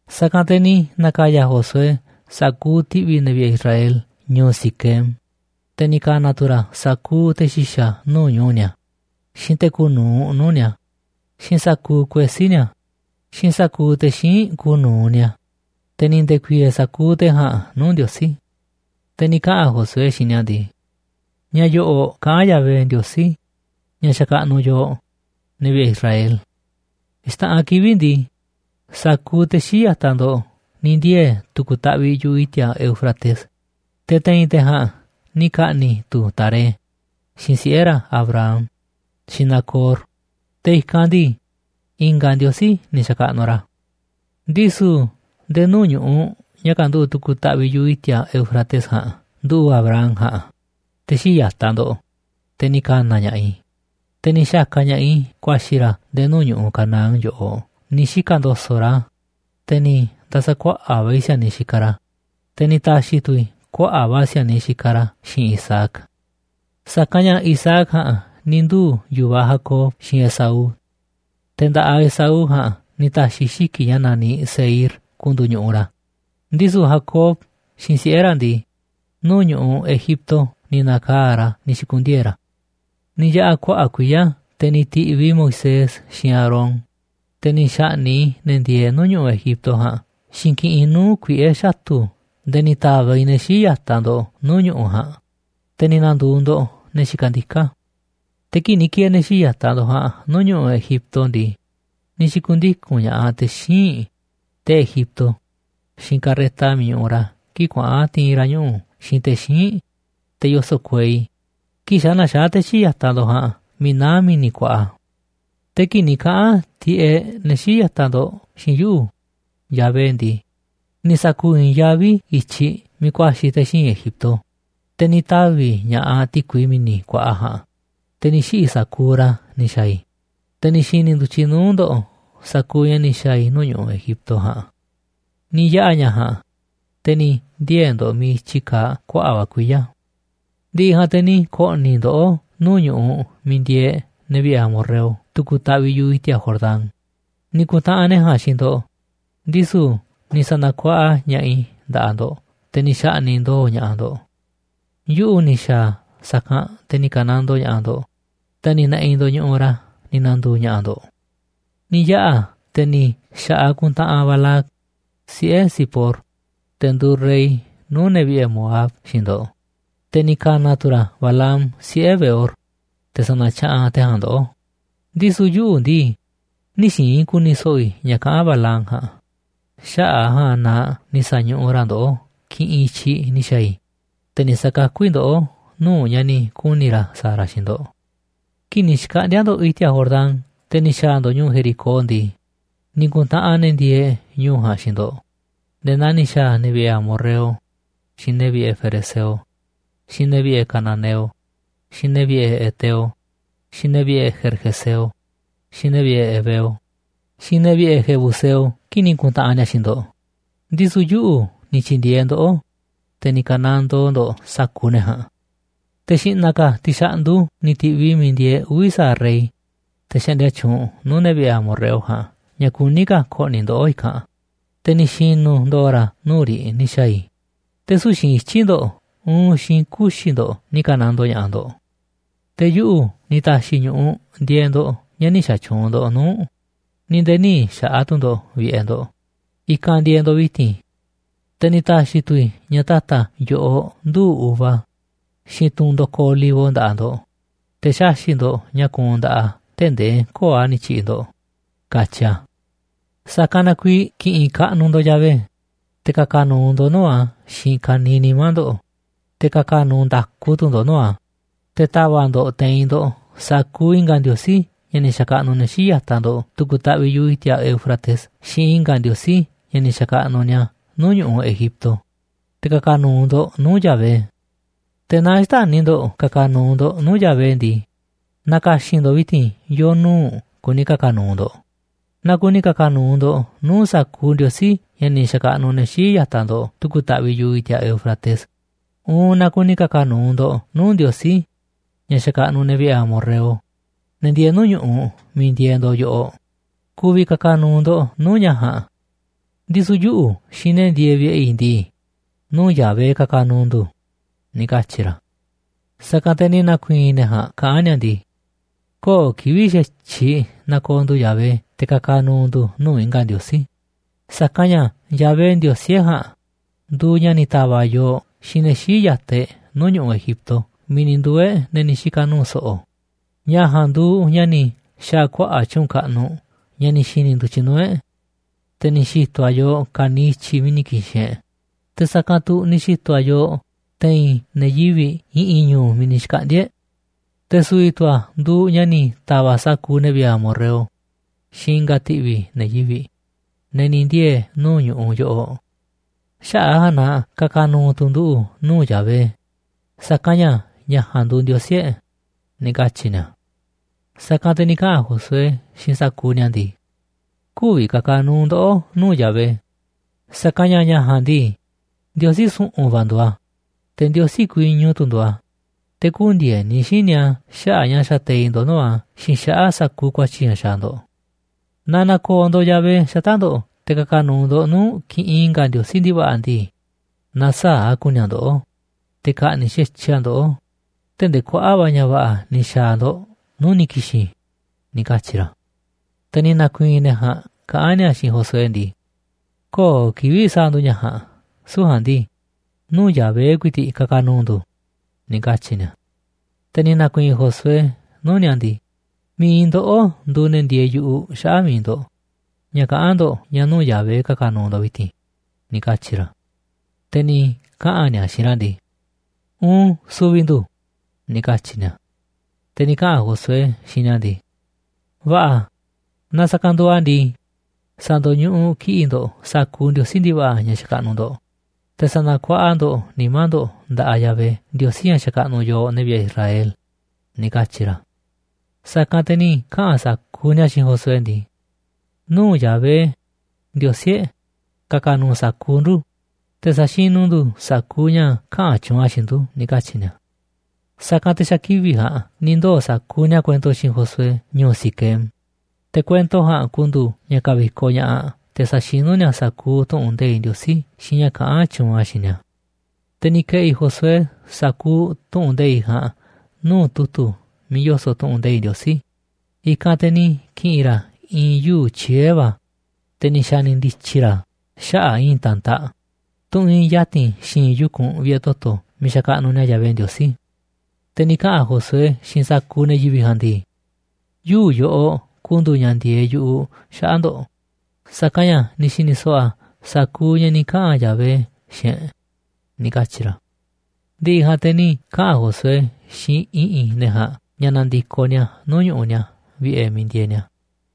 Sa̱kanꞌ te̱ ni̱ na̱ka̱ya̱ Josué sa̱kuuꞌ ti̱ꞌvi̱ ne̱ vi̱ꞌe̱ Israel ñu̱u̱ Siquem, te̱ ni̱ ka̱na̱ tu̱ ra̱ sa̱kuuꞌ te̱ xi̱xa̱ nuu̱ꞌ ñu̱u̱ ni̱a̱, xiinꞌ te̱ kuuꞌ nu̱uꞌ nuu̱ꞌ ni̱a̱, xiinꞌ sa̱kuuꞌ kuesí ni̱a̱, xiinꞌ sa̱kuuꞌ te̱ xíinꞌ kuuꞌ nu̱uꞌ ni̱a̱, te̱ ni̱ nde̱ku̱i̱e̱e̱ sa̱kuuꞌ te̱ ja̱a̱nꞌ nuu̱ꞌ Ndiosí. Te̱ ni̱ kaꞌa̱n Josué xiinꞌ ni̱a̱ ndii: ―Ña̱ yo̱ꞌo̱ꞌ kaꞌán Yahvé, Ndiosí ña̱ xakaꞌnuꞌ yooꞌ, ne̱ vi̱ꞌe̱ Israel: “Xta̱ꞌanꞌ kivi̱ꞌ ndii, sa̱kuuꞌ te̱ xii̱ꞌ ya̱taꞌ ndo̱ꞌ ni̱ ndiee̱ tu̱ku̱ taꞌviꞌ yu̱ꞌuꞌ i̱ti̱a̱ Éufrates. Te̱ te̱i̱n te̱ ja̱a̱nꞌ ni̱ ka̱ꞌni̱ tu̱ Taré, xiinꞌ siꞌe̱ ra̱, Abraham, xiinꞌ Nacor, te̱ i̱kanꞌ ndii, i̱nga̱ ndiosí ni̱ xa̱kaꞌnuꞌ ra̱. Ndisu̱ nde̱e̱ nuu̱ꞌ ñu̱ꞌuꞌ ña̱ kanduꞌu̱ꞌ tu̱ku̱ taꞌviꞌ yu̱ꞌuꞌ i̱ti̱a̱ Éufrates ja̱a̱nꞌ nduꞌu̱ꞌ Abraham ja̱a̱nꞌ, te̱ xii̱ꞌ ya̱taꞌ ndo̱ꞌ, te̱ ni̱ ka̱na̱ ña̱ꞌaꞌ i̱, te̱ ni̱ xa̱ka̱ ña̱ꞌaꞌ i̱ ku̱a̱xi̱ ra̱ nde̱e̱ nuu̱ꞌ ñu̱ꞌuꞌ Canaán yoꞌoꞌ ni̱ xika̱ ndo̱so̱ꞌ ra̱. Te̱ ni̱ nda̱sa̱ kuaꞌa̱ꞌ va̱ i̱ si̱a̱niꞌ xikaꞌ ra̱, te̱ ni̱ ta̱xi̱ tu̱ i̱ kuaꞌa̱ꞌ va̱ si̱a̱niꞌ xikaꞌ ra̱ xiin Isaac. Sa̱kanꞌ ña̱ Isaac ja̱a̱nꞌ ni̱ nduu̱ yu̱vaꞌ Jacob xiinꞌ Esaú. Te̱ nda̱ꞌaꞌ Esaú ja̱a̱nꞌ ni̱ ta̱xi̱ i̱ xiki̱ꞌ ña̱ naniꞌ Seír ku̱ndu̱u̱ ñu̱ꞌuꞌ ra̱, ndisu̱ Jacob xiinꞌ siꞌe̱ ra̱ ndii, nuu̱ꞌ ñu̱ꞌuꞌ Egipto ni̱ na̱kaa̱ꞌ ra̱ ni̱ xi̱ku̱ndiee̱ ra̱. ’Ni̱ yaꞌa̱ kuaꞌa̱ꞌ kuiya̱ te̱ ni̱ ti̱ꞌviꞌ i̱ Moisés xiinꞌ Aarón, te̱ ni̱ xa̱ꞌni̱ꞌ i̱ ne̱ ndieeꞌ nuu̱ꞌ ñu̱ꞌuꞌ Egipto ja̱a̱nꞌ xiinꞌ kiꞌinꞌ nuu̱ꞌ kuiꞌe̱ xatu̱ nde̱e̱ ni̱ ta̱va̱ꞌ i̱ ne̱ xii̱ꞌ ya̱taꞌ ndo̱ꞌ nuu̱ꞌ ñu̱ꞌuꞌ ja̱a̱nꞌ, te̱ ni̱ na̱ndu̱u̱ ndo̱ꞌ ne̱ xikaꞌ ndiká. Te̱ kii̱ꞌ ni̱ ki̱e̱e̱ ne̱ xii̱ꞌ ya̱taꞌ ndo̱ꞌ ja̱a̱nꞌ nuu̱ꞌ ñu̱ꞌuꞌ Egipto ndii, ni̱ xi̱ku̱ndiku̱n ña̱ꞌaꞌ te̱ xíinꞌ, te̱ Egipto, xiinꞌ carreta miiꞌ ñuꞌuꞌ ra̱ kii̱ꞌ kuaꞌa̱n ti̱i̱n ra̱ ñuꞌu̱ xiinꞌ te̱ xíinꞌ, te̱ yoso̱ꞌ kuei, kii̱ꞌ xa̱ naxaá te̱ xii̱ꞌ ya̱taꞌ ndo̱ꞌ ja̱a̱nꞌ miiꞌ naá Mi̱ni̱ Kuaꞌa. Te̱ kii̱ꞌ ni̱ kaꞌa̱n tiꞌeꞌ ne̱ xii̱ꞌ ya̱taꞌ ndo̱ꞌ xiinꞌ yuꞌu̱, Yahvé ndii, ni̱ sa̱ku̱u̱ i̱i̱nyaví i̱ i̱tyiꞌ miiꞌ ku̱a̱xi̱ te̱ xíinꞌ Egipto, te̱ ni̱ tavi̱ ña̱ꞌaꞌ ti̱kui mi̱ni̱ kuaꞌa ja̱a̱nꞌ, te̱ ni̱ xiꞌi̱ sa̱kuuꞌ ra̱ ni̱ xa̱a̱ i̱, te̱ ni̱ xi̱ni̱ ndu̱tyiꞌ nuu̱ꞌ ndo̱ꞌ sa̱kuuꞌ ña̱ ni̱ xa̱a̱ i̱ nuu̱ꞌ ñu̱ꞌuꞌ Egipto ja̱a̱nꞌ. Ni̱ yaꞌa̱ ña̱ ja̱a̱nꞌ, te̱ ni̱ ndiee̱ ndo̱ꞌ miiꞌ i̱tyi kaaꞌ kuaꞌa̱ꞌ va̱ kuiya̱. ’Ndi̱ꞌi̱ ja̱a̱nꞌ te̱ ni̱ ko̱ꞌni̱ i̱ ndoꞌó nuu̱ꞌ ñu̱ꞌuꞌ miiꞌ ndieeꞌ ne̱ vi̱ꞌe̱ amorreo tu̱ku̱ taꞌviꞌ yu̱ꞌuꞌ i̱ti̱a̱ Jordán, ni̱ ku̱ntaꞌanꞌ ne̱ ja̱a̱nꞌ xiinꞌ ndo̱ꞌ, ndisu̱ ni̱ sa̱na̱kuaꞌa ña̱ꞌaꞌ i̱ nda̱ꞌaꞌ ndo̱ꞌ, te̱ ni̱ xa̱ꞌni̱ꞌ ndo̱o̱ ña̱ꞌaꞌ ndo̱ꞌ. Yuꞌu̱ ni̱ xa̱a̱ sa̱kanꞌ te̱ ni̱ ka̱nandoo ña̱ꞌaꞌ ndo̱ꞌ, te̱ ni̱ ne̱ꞌi̱ ndo̱ꞌ ñu̱ꞌuꞌ ra̱ ni̱ na̱ndu̱u̱ ña̱ꞌa̱ ndo̱ꞌ. Ni̱ yaꞌa̱ te̱ ni̱ xa̱ꞌaꞌ kuntaꞌanꞌ Balac, siꞌe̱ Zipor, te̱ nduuꞌ rey nuu̱ꞌ ne̱ vi̱ꞌe̱ Moab, xiinꞌ ndo̱ꞌ, te̱ ni̱ ka̱na̱ tu̱ ra̱ Balaam, siꞌe̱ Beor, te̱ sa̱na̱tyaꞌanꞌ te̱ ja̱a̱nꞌ ndoꞌó. Ndisu̱ yuꞌu̱ ndii, nï̱ xi̱i̱n i̱ ku̱ni̱ so̱ꞌo̱ i̱ ña̱ kaꞌán Balaam ja̱a̱nꞌ, xaꞌa̱ꞌ a̱ ja̱a̱nꞌ na ni̱ sa̱ñuꞌuꞌ ra̱ ndoꞌó kiꞌinꞌ i̱tyiꞌ ni̱ xa̱a̱ i̱, te̱ ni̱ sa̱kakú i̱ ndoꞌó nuu̱ꞌ ña̱ ni̱ kuni̱ ra̱ sa̱a̱ ra̱ xiinꞌ ndo̱ꞌ. ’Kii̱ꞌ ni̱ xkaꞌndi̱a̱ ndo̱ꞌ i̱ti̱a̱ Jordán, te̱ ni̱ xa̱a̱ ndo̱ꞌ ñu̱u̱ Jericó ndii, ni̱ ku̱ntaꞌanꞌ ne̱ ndieeꞌ ñu̱u̱ ja̱a̱nꞌ xiinꞌ ndo̱ꞌ nde̱e̱ naa ni̱ xa̱a̱ ne̱ vi̱ꞌe̱ amorreo, xiinꞌ ne̱ vi̱ꞌe̱ ferezeo, xiinꞌ ne̱ vi̱ꞌe̱ cananeo, xiinꞌ ne̱ vi̱ꞌe̱ heteo, xiinꞌ ne̱ vi̱ꞌe̱ gergeseo, xiinꞌ ne̱ vi̱ꞌe̱ heveo, xiinꞌ ne̱ vi̱ꞌe̱ jebuseo kii̱ꞌ ni̱ ku̱ntaꞌanꞌ ni̱a̱ xiinꞌ ndo̱ꞌ. Ndisu̱ yuꞌu̱ ni̱ tyi̱ndi̱e̱eꞌ ndoꞌó, te̱ ni̱ ka̱nandoo ndo̱ꞌ sa̱kuuꞌ ne̱ ja̱a̱nꞌ. Te̱ xi̱ꞌna̱ ka̱ ti̱xa̱ꞌndu ni̱ ti̱ꞌviꞌ i̱ miiꞌ ndieeꞌ uvi̱ sa̱aꞌ rey, te̱ xaꞌndia tyuunꞌ nuu̱ꞌ ne̱ vi̱ꞌe̱ amorreo ja̱a̱nꞌ ña̱ kuní ka̱ ko̱ꞌni̱ ndoꞌó i̱kanꞌ, te̱ ni̱ xi̱nu̱ ndo̱o̱ ra̱ nuu̱ꞌ riꞌ ni̱ xa̱a̱ i̱, te̱ süu̱ꞌ xiinꞌ ityi̱ ndo̱ꞌ uun xiinꞌ kuxi̱ ndo̱ꞌ ni̱ ka̱nandoo ña̱ꞌaꞌ ndo̱ꞌ. Te̱ yuꞌu̱ ni̱ ta̱xi̱ ñu̱ꞌuꞌ ndieeꞌ ndo̱ꞌ ña̱ nï̱ xa̱tyuunꞌ ndo̱ꞌ nuu̱ꞌ, ni̱ nde̱e̱ nï̱ xa̱ꞌa̱ tu̱ ndo̱ꞌ vi̱ꞌe̱ ndo̱ꞌ, i̱kanꞌ ndieeꞌ ndo̱ꞌ vi̱ti̱n. Te̱ ni̱ ta̱xi̱ tu̱ i̱ ña̱ ta̱ta̱ yo̱ꞌoꞌ nduu̱ꞌ uva, xiinꞌ tunꞌ ndo̱koꞌ olivo nda̱ꞌaꞌ ndo̱ꞌ, te̱ xaxi̱ꞌ ndo̱ꞌ ña̱ kuunꞌ nda̱ꞌaꞌ a̱ tee̱ꞌ ndee köo̱ꞌ a̱ ni̱ tyi̱ꞌi̱ ndo̱ꞌ”, katyi a̱. ’Sa̱kanꞌ na kuiiꞌ ki̱ꞌi̱n kaꞌnuꞌ ndo̱ꞌ Yahvé, te̱ ka̱ka̱ nu̱u̱ ndo̱ꞌ nuu̱ꞌ a̱ xiinꞌ ka̱niiꞌ nimá ndo̱ꞌ, te̱ ka̱ka̱ nu̱u̱ nda̱ku tu̱ ndo̱ꞌ nuu̱ꞌ a̱. Te̱ ta̱va̱ꞌ ndo̱ꞌ te̱i̱n ndo̱ꞌ sa̱kuuꞌ i̱nga̱ ndiosí ña̱ ni̱ xa̱kaꞌnuꞌ ne̱ xii̱ꞌ ya̱taꞌ ndo̱ꞌ tu̱ku̱ taꞌviꞌ yu̱ꞌuꞌ i̱ti̱a̱ Éufrates xiinꞌ i̱nga̱ ndiosí ña̱ ni̱ xa̱kaꞌnuꞌ ni̱a̱ nuu̱ꞌ ñu̱ꞌuꞌ Egipto, te̱ ka̱ka̱ nu̱u̱ ndo̱ꞌ nuu̱ꞌ Yahvé. Te̱ naaꞌ xtäni̱ ndo̱ꞌ ka̱ka̱ nu̱u̱ ndo̱ꞌ nuu̱ꞌ Yahvé ndii, na̱ka̱xi̱n ndo̱ꞌ vi̱ti̱n yo̱o̱ nuu̱ꞌ kuni ka̱ka̱ nu̱u̱ ndo̱ꞌ. Naaꞌ kuni ka̱ka̱ nu̱u̱ ndo̱ꞌ nuu̱ꞌ sa̱kuuꞌ ndiosí ña̱ ni̱ xa̱kaꞌnuꞌ ne̱ xii̱ꞌ ya̱taꞌ ndo̱ꞌ tu̱ku̱ taꞌviꞌ yu̱ꞌuꞌ i̱ti̱a̱ Éufrates, uun naaꞌ kuni ka̱ka̱ nu̱u̱ ndo̱ꞌ nuu̱ꞌ ndiosí, ña̱ xakaꞌnuꞌ ne̱ vi̱ꞌe̱ amorreo, ne̱ ndieeꞌ nuu̱ꞌ ñu̱ꞌuꞌ miiꞌ ndieeꞌ ndo̱ꞌ yoꞌoꞌ, ku̱vi̱ ka̱ka̱ nu̱u̱ ndo̱ꞌ nuu̱ꞌ ña̱ ja̱a̱nꞌ. Ndisu̱ yuꞌu̱ xiinꞌ ne̱ ndieeꞌ vi̱ꞌe̱ i̱ ndii, nuu̱ꞌ Yahvé ka̱ka̱ nu̱u̱ ndu̱ ―ni̱ katyi̱ ra̱. Sa̱kanꞌ te̱ ni̱ na̱ku̱i̱i̱n ne̱ ja̱a̱nꞌ kaꞌán ni̱a̱ ndii: ―Köo̱ꞌ kivi̱ꞌ xa̱tyiꞌ na̱ko̱o̱ ndu̱ Yahvé te̱ ka̱ka̱ nu̱u̱ ndu̱ nuu̱ꞌ i̱nga̱ ka̱ ndiosí, sa̱kanꞌ ña̱ Yahvé, Ndiosí e̱ꞌ ja̱a̱nꞌ, nduuꞌ ña̱ ni̱ ta̱va̱ꞌ yooꞌ xiinꞌ ne̱ xii̱ꞌ ya̱taꞌ e̱ꞌ nuu̱ꞌ ñu̱ꞌuꞌ Egipto miiꞌ ni̱ nduu̱ e̱ꞌ ne̱ ni̱ xika̱ nu̱u̱ so̱ꞌo̱. Ña̱ ja̱a̱nꞌ nduuꞌ ña̱ ni̱ xa̱a̱ kuaꞌa̱ꞌ tyu̱u̱n kaꞌnuꞌ ña̱ ni̱ xi̱ni̱ ndu̱tyiꞌ nuu̱ꞌ e̱ꞌ. Te̱ ni̱ xi̱to̱ a̱ yooꞌ ka̱niiꞌ i̱tyiꞌ miiꞌ ni̱ ki̱xi̱n e̱ꞌ, te̱ sa̱kanꞌ tu̱ ni̱ xi̱to̱ a̱ yooꞌ te̱i̱n ne̱ yivi̱ꞌ i̱ꞌi̱n ñu̱u̱ miiꞌ ni̱ xkaꞌndi̱a̱ e̱ꞌ. Te̱ su̱vi̱ tu̱ a̱ nduuꞌ ña̱ ni̱ ta̱va̱ꞌ sa̱kuuꞌ ne̱ vi̱ꞌe̱ amorreo xiinꞌ i̱nga̱ ti̱ꞌvi̱ ne̱ yivi̱ꞌ, ne̱ ni̱ ndiee̱ nuu̱ꞌ ñu̱ꞌuꞌ yoꞌoꞌ. Xaꞌa̱ꞌ a̱ ja̱a̱nꞌ na ka̱ka̱ nu̱u̱ tu̱ nduꞌu̱ nuu̱ꞌ Yahvé, sa̱kanꞌ ña̱ ña̱ ja̱a̱nꞌ nduuꞌ Ndiosí e̱ꞌ ―ni̱ katyi̱ ni̱a̱. Sa̱kanꞌ te̱ ni̱ kaꞌa̱n Josué xiinꞌ sa̱kuuꞌ ni̱a̱ ndii: ―Kü̱vi̱ ka̱ka̱ nu̱u̱ ndoꞌó nu̱uꞌ Yahvé, sa̱kanꞌ ña̱ ña̱ ja̱a̱nꞌ ndii, Ndiosí su̱ꞌu̱n va̱ nduuꞌ a̱, te̱ Ndiosí kuiñu tu̱ nduuꞌ a̱, te̱ kü̱ndi̱e̱ni xíniꞌ a̱ xaꞌa̱ꞌ ña̱ xateiꞌ ndo̱ꞌ nuu̱ꞌ a̱ xiinꞌ xaꞌa̱ꞌ sa̱kuuꞌ ku̱a̱tyi̱ ña̱ xaaꞌ ndo̱ꞌ. Naaꞌ na̱ko̱o̱ ndo̱ꞌ Yahvé xata̱ꞌ ndo̱ꞌ te̱ ka̱ka̱ nu̱u̱ ndo̱ꞌ nuu̱ꞌ kiꞌinꞌ i̱nga̱ ndiosí ndi̱va̱ꞌa̱ ndii, na̱saa̱ꞌ a̱ ku̱ni̱ a̱ ndoꞌó, te̱ ka̱ꞌni̱ꞌ xa̱tyiꞌ a̱ ndoꞌó tee̱ꞌ ndee kuaꞌa̱ꞌ va̱ ña̱ va̱ꞌa̱ ni̱ xa̱a̱ a̱ ndo̱ꞌ nuu̱ꞌ ni̱ ki̱xi̱n ―ni̱ katyi̱ ra̱. Te̱ ni̱ na̱ku̱i̱i̱n ne̱ ja̱a̱nꞌ kaꞌán ni̱a̱ xiinꞌ Josué ndii: ―¡Köo̱ꞌ kivi̱ꞌ sa̱a̱ ndu̱ ña̱ ja̱a̱nꞌ! Süu̱ꞌ ja̱a̱nꞌ ndii, nuu̱ꞌ Yahvé ku̱i̱ti̱ꞌ ka̱ka̱ nu̱u̱ ndu̱ ―ni̱ katyi̱ ni̱a̱. Te̱ ni̱ na̱ku̱i̱i̱n Josué nuu̱ꞌ ni̱a̱ ndii. ―Mi̱iꞌ ndoꞌó nduuꞌ ne̱ ndieeꞌ yu̱ꞌuꞌ xaꞌa̱ꞌ mi̱iꞌ ndo̱ꞌ ña̱ kaꞌán ndo̱ꞌ ña̱ nuu̱ꞌ Yahvé ka̱ka̱ nu̱u̱ vi̱ti̱n ―ni̱ katyi̱ ra̱. Te̱ ni̱ kaꞌa̱n ni̱a̱ xiinꞌ ra̱ ndii: ―Uun, su̱vi̱ ndu̱ ―ni̱ katyi̱ ni̱a̱. Te̱ ni̱ kaꞌa̱n Josué xiinꞌ ni̱a̱ ndii: ―Va̱ꞌa̱, naaꞌ sa̱kanꞌ nduuꞌ a̱ ndii, sa̱ndo̱ñuꞌuꞌ kiꞌi̱ꞌ ndo̱ꞌ sa̱kuuꞌ ndiosí ndi̱va̱ꞌa̱ ña̱ xakaꞌnuꞌ ndo̱ꞌ. Te̱ sa̱na̱kuaꞌa ndo̱ꞌ nimá ndo̱ꞌ nda̱ꞌaꞌ Yahvé, Ndiosí ña̱ xakaꞌnuꞌ yooꞌ, ne̱ vi̱ꞌe̱ Israel ―ni̱ katyi̱ ra̱. Sa̱kanꞌ te̱ ni̱ kaꞌa̱n sa̱kuuꞌ ni̱a̱ xiinꞌ Josué ndii: ―Nuu̱ꞌ Yahvé, Ndiosí e̱ꞌ, ka̱ka̱ nu̱u̱ sa̱kuuꞌ ndu̱, te̱ sa̱xinu̱ ndu̱ sa̱kuuꞌ ña̱ kaꞌa̱n tyuunꞌ a̱ xiinꞌ ndu̱ ―ni̱ katyi̱ ni̱a̱. Sa̱kanꞌ te̱ xa̱ kivi̱ꞌ ja̱a̱nꞌ ni̱ ndoo̱ sa̱kuuꞌ ni̱a̱ kuento xiinꞌ Josué ñu̱u̱ Siquem, te̱ kuento ja̱a̱nꞌ ku̱ndu̱u̱ ña̱ ka̱vi̱koꞌ ña̱ꞌaꞌ te̱ sa̱xinú ni̱a̱ sa̱kuuꞌ tu̱ꞌu̱n nde̱iꞌ Ndiosí xiinꞌ ña̱ kaꞌán tyuunꞌ a̱ xiinꞌ ni̱a̱. Te̱ ni̱ ke̱ꞌi̱ Josué sa̱kuuꞌ tu̱ꞌu̱n nde̱iꞌ ja̱a̱nꞌ nuu̱ꞌ tu̱tu̱ miiꞌ yoso̱ꞌ tu̱ꞌu̱n nde̱iꞌ Ndiosí. I̱kanꞌ te̱ ni̱ ki̱ꞌi̱n ra̱ i̱i̱n yuu̱ꞌ tyiee̱ va̱, te̱ ni̱ xa̱ni̱ ndi̱tyi̱ ra̱ a̱ xaꞌa̱ꞌ i̱i̱n ta̱ntaꞌ, tunꞌ iinꞌ ya̱ti̱n xi̱i̱nꞌ yu̱kunꞌ vi̱ꞌe̱ toto̱ miiꞌ xakaꞌnuꞌ ni̱a̱ Yahvé Ndiosí. Te̱ ni̱ kaꞌa̱n Josué xiinꞌ sa̱kuuꞌ ne̱ yivi̱ꞌ ja̱a̱nꞌ ndii: ―Yuu̱ꞌ yoꞌoꞌ ku̱ndu̱u̱ ña̱ ndieeꞌ yu̱ꞌuꞌ xaꞌa̱ꞌ ndo̱ꞌ, sa̱kanꞌ ña̱ ni̱ xi̱ni̱ so̱ꞌo̱ a̱ sa̱kuuꞌ ña̱ ni̱ kaꞌa̱n Yahvé xiinꞌ e̱ꞌ ―ni̱ katyi̱ ra̱. Ndi̱ꞌi̱ ja̱a̱nꞌ te̱ ni̱ kaꞌa̱n Josué xiinꞌ i̱ꞌi̱n ne̱ ja̱a̱nꞌ ña̱ na̱ndi̱koꞌ ni̱a̱ nuu̱ꞌ ñu̱ꞌuꞌ ni̱a̱ vi̱ꞌe̱ miiꞌ ndieeꞌ ni̱a̱.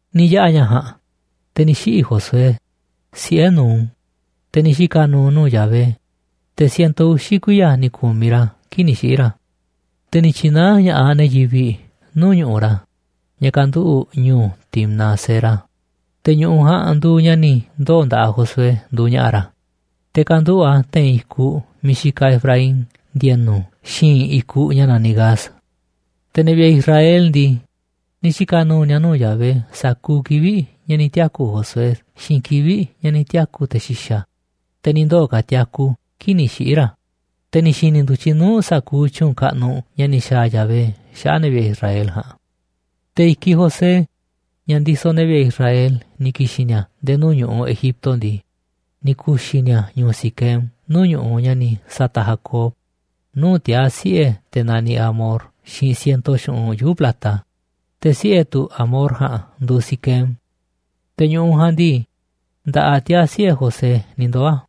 Ni̱ yaꞌa̱ ña̱ ja̱a̱nꞌ, te̱ ni̱ xiꞌi̱ Josué, siꞌe̱ Nun, te̱ ni̱ xika̱ nu̱u̱ nuu̱ꞌ Yahvé, te̱ siento uxi̱ kuiya̱ ni̱ ku̱miꞌ ra̱ kii̱ꞌ ni̱ xiꞌi̱ ra̱. Te̱ ni̱ tyi̱naá ña̱ꞌaꞌ ne̱ yivi̱ꞌ nuu̱ꞌ ñu̱ꞌuꞌ ra̱, ña̱ kanduꞌu̱ꞌ ñu̱u̱ Timnat-sera, te̱ ñu̱ꞌuꞌ ja̱a̱nꞌ nduuꞌ ña̱ ni̱ ndoo̱ nda̱ꞌaꞌ Josué nduuꞌ ña̱ꞌa̱ ra̱, te̱ kanduꞌu̱ꞌ a̱ te̱i̱n i̱kuꞌ miiꞌ xikaꞌ Efraín ndi̱e̱nu̱ xi̱i̱nꞌ i̱kuꞌ ña̱ naniꞌ Gaas. Te̱ ne̱ vi̱ꞌe̱ Israel ndii, ni̱ xika̱ nu̱u̱ ni̱a̱ nuu̱ꞌ Yahvé sa̱kuuꞌ kivi̱ꞌ ña̱ ni̱ tiaku̱ Josué xiinꞌ kivi̱ꞌ ña̱ ni̱ tiaku̱ te̱ xi̱xa̱, te̱ ni̱ ndoo̱ ka̱ tiaku kii̱ꞌ ni̱ xiꞌi̱ ra̱, te̱ ni̱ xi̱ni̱ ndu̱tyiꞌ nuu̱ꞌ sa̱kuuꞌ tyu̱u̱n kaꞌnuꞌ ña̱ ni̱ xa̱a̱ Yahvé xaꞌa̱ꞌ ne̱ vi̱ꞌe̱ Israel ja̱a̱nꞌ. Te̱ i̱kiꞌ José, ña̱ ndisoꞌ ne̱ vi̱ꞌe̱ Israel ni̱ ki̱xi̱n ni̱a̱ nde̱e̱ nuu̱ꞌ ñu̱ꞌuꞌ Egipto ndii, ni̱ ku̱xi̱ ni̱a̱ a̱ ñu̱u̱ Siquem nuu̱ꞌ ñu̱ꞌuꞌ ña̱ ni̱ sa̱ta̱ꞌ Jacob nuu̱ꞌ tiaa̱ siꞌe̱ te̱ naniꞌ Hamor xiinꞌ siento xu̱ꞌunꞌ yuu̱ꞌ plata, te̱ siꞌe̱ tu̱ Hamor ja̱a̱nꞌ nduuꞌ Siquem. Te̱ ñu̱ꞌuꞌ ja̱a̱nꞌ ndii, nda̱ꞌaꞌ tiaa̱ siꞌe̱ José ni̱ ndoo̱ a̱.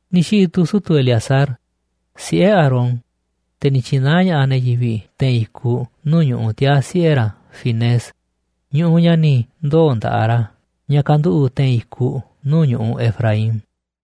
Ni̱ xiꞌi̱ tu̱ sutu̱ Eleazar, siꞌe̱ Aarón, te̱ ni̱ tyi̱naá ña̱ꞌaꞌ ne̱ yivi̱ꞌ te̱i̱n i̱kuꞌ nuu̱ꞌ ñu̱ꞌuꞌ tiaa̱ siꞌe̱ ra̱ Finees, ñu̱ꞌuꞌ ña̱ ni̱ ndoo̱ nda̱ꞌaꞌ ra̱ ña̱ kanduꞌu̱ꞌ te̱i̱n i̱kuꞌ nuu̱ꞌ ñu̱ꞌuꞌ Efraín.